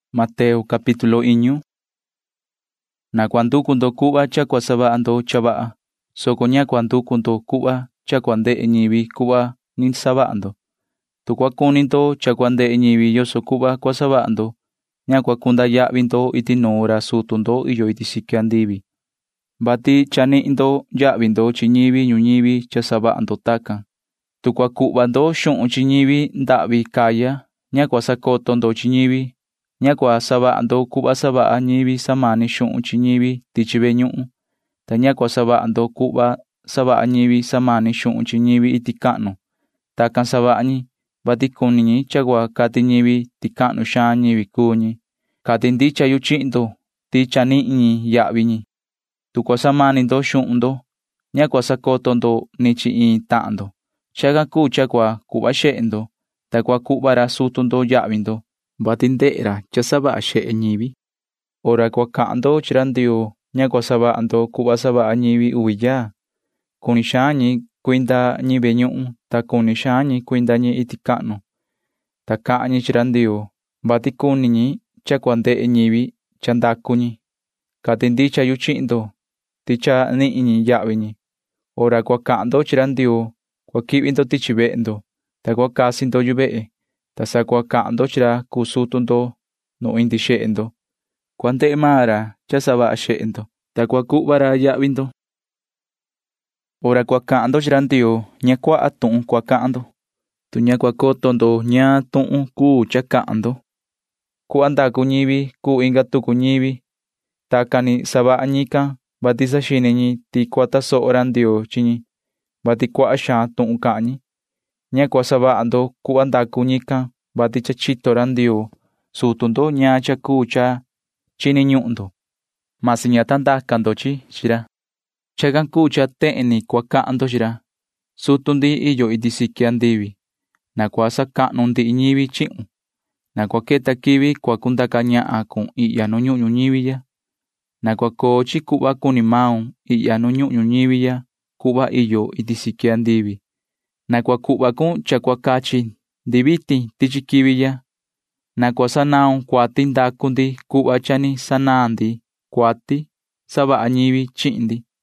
[Ni vii cahan ra Jesuu chi ñivi can:] ’Na cua nducu ndo cuhva cha cua savaha ndo cha vaha, soco ña cua nducu ndo cuhva cha cua ndehe ñivi cuhva ni savaha ndo. Tu cua cuni ndo cha cua ndehe ñivi yoso cuhva cua savaha ndo, ña cua cunda yahvi ndo iti nuun ra sutu ndo iyo iti siqui andivi, [vati cha nihin ndo yahvi ndo chi ñivi ñuñivi cha savaha ndo tacan]. Tu cua cuhva ndo xuhun chi ñivi ndahvi caya, ña cua sacoto ndo chi ñivi. Ña cua savaha ndo cuhva savaha ñivi samani xuhun chi ñivi tichi ve ñuhun, ta ña cua savaha ndo cuhva savaha ñivi samani xuhun chi ñivi iti cahnu. Tacan savaha ñi, vati cuni ñi cha cua cati ñivi ti cahnu xaan ñivi cuu ñi. Cati ndicha yu chihin ndo ti cha nihin ñi yahvi ñi. Tu cua samani ndo xuhun ndo, ña cua sacoto ndo ni chi iin tahan ndo. Chacan cuu cha cua cuhva xehe ndo, ta cua cuhva ra sutu ndo yahvi ndo, vati ndehe ra cha savaha xehe ñivi. [Ni vii cahan ra Jesuu chi ñivi can:] ’Hora cua cahan ndo chi ra Ndioo ña cua savaha ndo cuhva savaha ñivi uvi yaa. Cuni xaan ñi cuindi ñi ve ñuhun, ta cuni xaan ñi cuinda ñi iti cahnu, ta cahan ñi chi ra Ndioo, vati cuni ñi cha cua ndehe ñivi cha ndacu ñi. Cati ndicha yu chihin ndo ti cha nihin ñi yahvi ñi. Hora cua cahan ndo chi ra Ndioo cua quihvi ndo tichi vehe ndo, ta cua casi ndo yu vehe, ta sa cua cahan ndo chi ra cuu sutu ndo nu indi xehe ndo. Cua ndehe maan ra cha savaha xehe ndo, ta cua cuhva ra yahvi ndo. ’Hora cua cahan ndo chi ra Ndioo ña cua nducuaha tuhun cahan ndo, tu ña cua coto ndo ñaan tuhun cuu cha cahan ndo cuhva ndacu ñivi cuu inga tucu ñivi. Tacan ni savaha ñican, vati saxini ñi ti cua tasoho ra Ndioo chi ñi, vati cuaha xaan tuhun cahan ñi. Ña cua savaha ndo cuhva ndacu ñican, vati cha chito ra Ndioo sutu ndo ñaan cha cuu cha chini ñuhun ndo, ta ña ta ndaca ndo chi chi chihin ra. Chacan cuu cha tehen ni cua cahan ndo chi ra: Sutu ndi iyo iti siqui andivi, na cua sacahnu ndihi ñivi chihun. Na cua queta quivi cua cundaca ñahan cun ihya nu ñuhun ñuñivi ya. Na cua coo chi cuhva cuni maun ihya nu ñuhun ñuñivi ya cuhva iyo chi iti siqui andivi. Na cua cuhva cun cha cua cachi ndi vitin tichi quivi ya. Na cua sanaun cuati ndacu ndi cuhva cha ni sanaan ndi cuati savaha ñivi chihin ndi.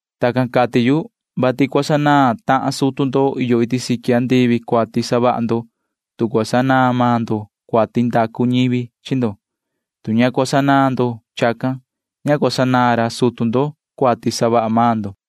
’[Tacan cati yu,] vati cua sanaan tahan sutu ndo iyo iti siqui andivi cuati savaha ndo, tu cua sanaan maan ndo cuati ndacu ñivi chi ndo. Tu ña cua sanaan ndo chacan, ña cua sanaan ra sutu ndo cuati savaha maan ndo.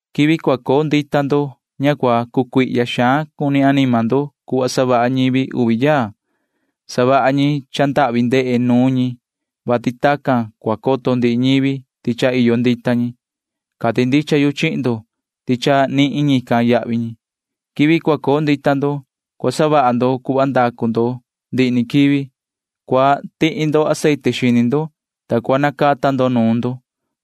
[Ni vii cahan ra Jesuu chi ñivi can:] ’Quivi cua coo ndita ndo ña cua cucuihya xaan cuni anima ndo cuhva savaha ñivi uvi yaa. Savaha ñi cha ndahvi ndehe nuun ñi, vati tacan cua coto ndihi ñivi ti cha iyo ndita ñi. Cati ndicha yu chihin ndo ti cha nihin ñican yahvi ñi. Quivi cua coo ndita ndo [cua savaha ndo cuhva ndacu ndo ndihi ni quivi]. Cua tihi ndo aceite xini ndo, ta cua nacata ndo nuun ndo,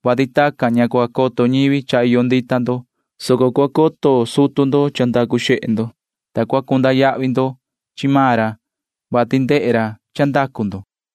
vati tacan ña cua coto ñivi cha iyo ndita ndo, soco cua coto sutu ndo cha ndacu xehe ndo, ta cua cunda yahvi ndo chi maan ra, vati ndehe ra cha ndacu ndo.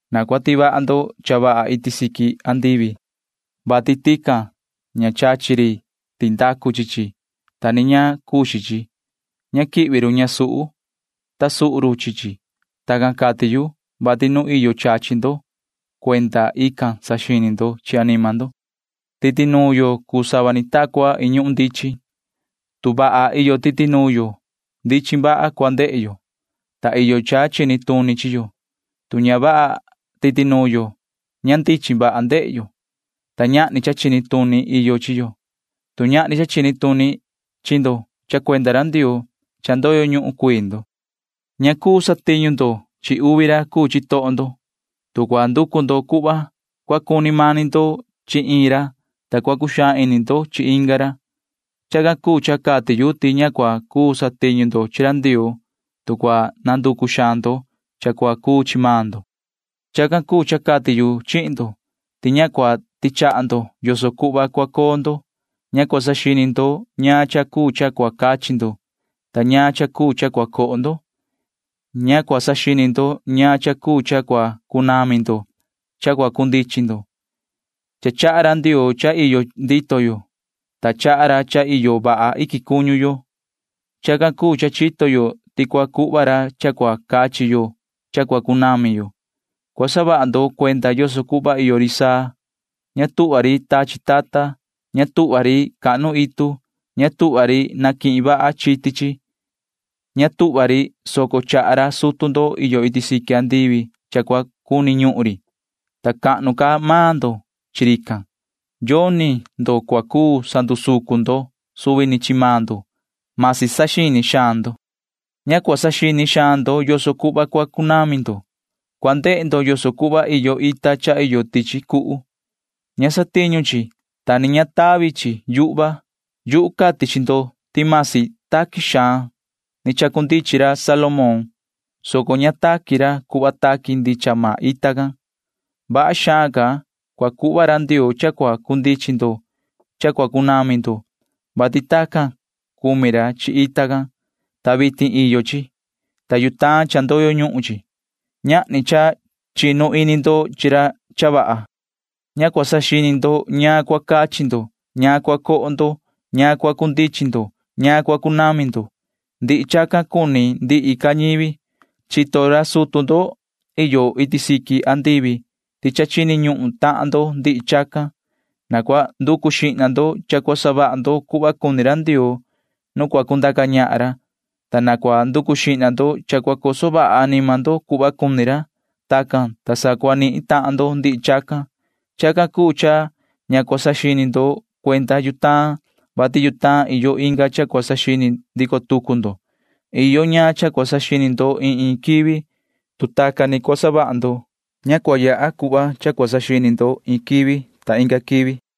Na cua tivaha ndo cha vaha iti siqui andivi, vati tican ña chachi ri tindacu chi chi, ta ni ña cuxin chi. Ña quihvi run ñasuhu, ta suhu run chi chi. Tacan cati yu, vati nu iyo chachi ndo―cuenda ican saxini ndo chi anima ndo. [Ni vii cahan ra Jesuu chi ñivi can:] ’Titi nuun yo cuu sava ni ta cua iin ñuhun ndichin. Tu vaha iyo titi nuun yo, ndichin vaha cua ndehe yo, [ta iyo cha chini tuni chi yo]. Tu ña vaha titi nuun yo, ña ndichin vaha ndehe yo, [ta ñahni cha chini tuni iyo chi yo]. Tu ñahni cha chini tuni chi ndo cha cuenda ra Ndioo, cha ndoyo ñuhun cuii ndo. [Ni vii cahan ra Jesuu chi ñivi can:] ’Ña cuu satiñu ndo chi uvi ra cuu chitoho ndo. Tu cua nducu ndo cuhva, cua cuni mani ndo chi iin ra, ta cua cuxaan ini ndo chi inga ra. Chacan cuu cha cati yu ti ña cua cuu satiñu ndo chi ra Ndioo, tu cua nanducu xaan ndo cha cua cuu chi maan ndo. [Ni vii cahan ra Jesuu chi ñivi can:] ’Chacan cuu cha cati yu chihin ndo ti ña cua tichaha ndo yoso cuhva cua coo ndo. Ña cua saxini ndo ñaan cha cuu cha cua cachi ndo ta ñaan cha cuu cha cua coho ndo. Ña cua saxini ndo ñaan cha cuu cha cua cunami ndo cha cua cundichin ndo. Cha chaha ra Ndioo cha iyo ndito yo, ta chaha ra cha iyo vaha iquin cuñu yo. Chacan cuu cha chito yo ti cua cuhva ra cha cua cachi yo cha cua cunami yo. Cua saha ndo cuenda yoso cuhva iyo ri saa. Ña tuhva ri tachi tata. Ña tuhva ri cahnu itu. Ña tuhva ri canihin vaha chiti chi. Ña tuhva ri, soco chaha ra sutu ndo iyo iti siqui andivi cha cua cuni ñuhun ri, ta cahnu ca maan ndo chi rican. Yoni ndo cua cuu sandusucun ndo suvi ni chi maan ndo―masi saxini xaan ndo. ’Ña cua saxini xaan ndo yoso cuhva cua cunami ndo. Cua ndehe ndo yoso cuhva iyo ita cha iyo tichi cuhu. Ña satiñu chi, ta ni ña tavi chi yuhva. Yuhu cati chi ndo ti vasi taqui suhva ni chacundichin ra Salomón, soco ña taqui ra cuhva taqui ndicha maan ita can. Vaha xaan ca cua cuhva ra Ndioo cha cua cundichin ndo cha cua cunami ndo, vati tacan cumi ra chi ita can, ta vitin iyo chi, ta yutaan cha ndoyo ñuhun chi. Ñahni cha chinu ini ndo chi ra cha vaha. Ña cua saxini ndo ñaan cua cachi ndo ñaan cua coho ndo ñaan cua cundichin ndo ñaan cua cunami ndo. Ndihi chacan cuni ndihi ca ñivi. Chito ra sutu ndo iyo iti siqui andivi ti cha chini ñuhun tahan ndo ndihi chacan. Na cua nducu xihna ndo cha cua savaha ndo cuhva cuni ra Ndioo nu cua cundaca ñahan ra, ta na cua nducu xihna ndo cha cua coso vaha anima ndo cuhva cuni ra. Tacan, ta sa cua nihin tahan ndo ndihi chacan. Chacan cuu cha ña cua saxini ndo cuenda yutaan, vati yutaan iyo inga cha cua saxini ndico tucu ndo. Iyo ñaan cha cua saxini ndo iin iin quivi. [Tu tacan ni cua savaha ndo, ña cua yaha cuhva cha cua saxini ndo iin quivi inga quivi.]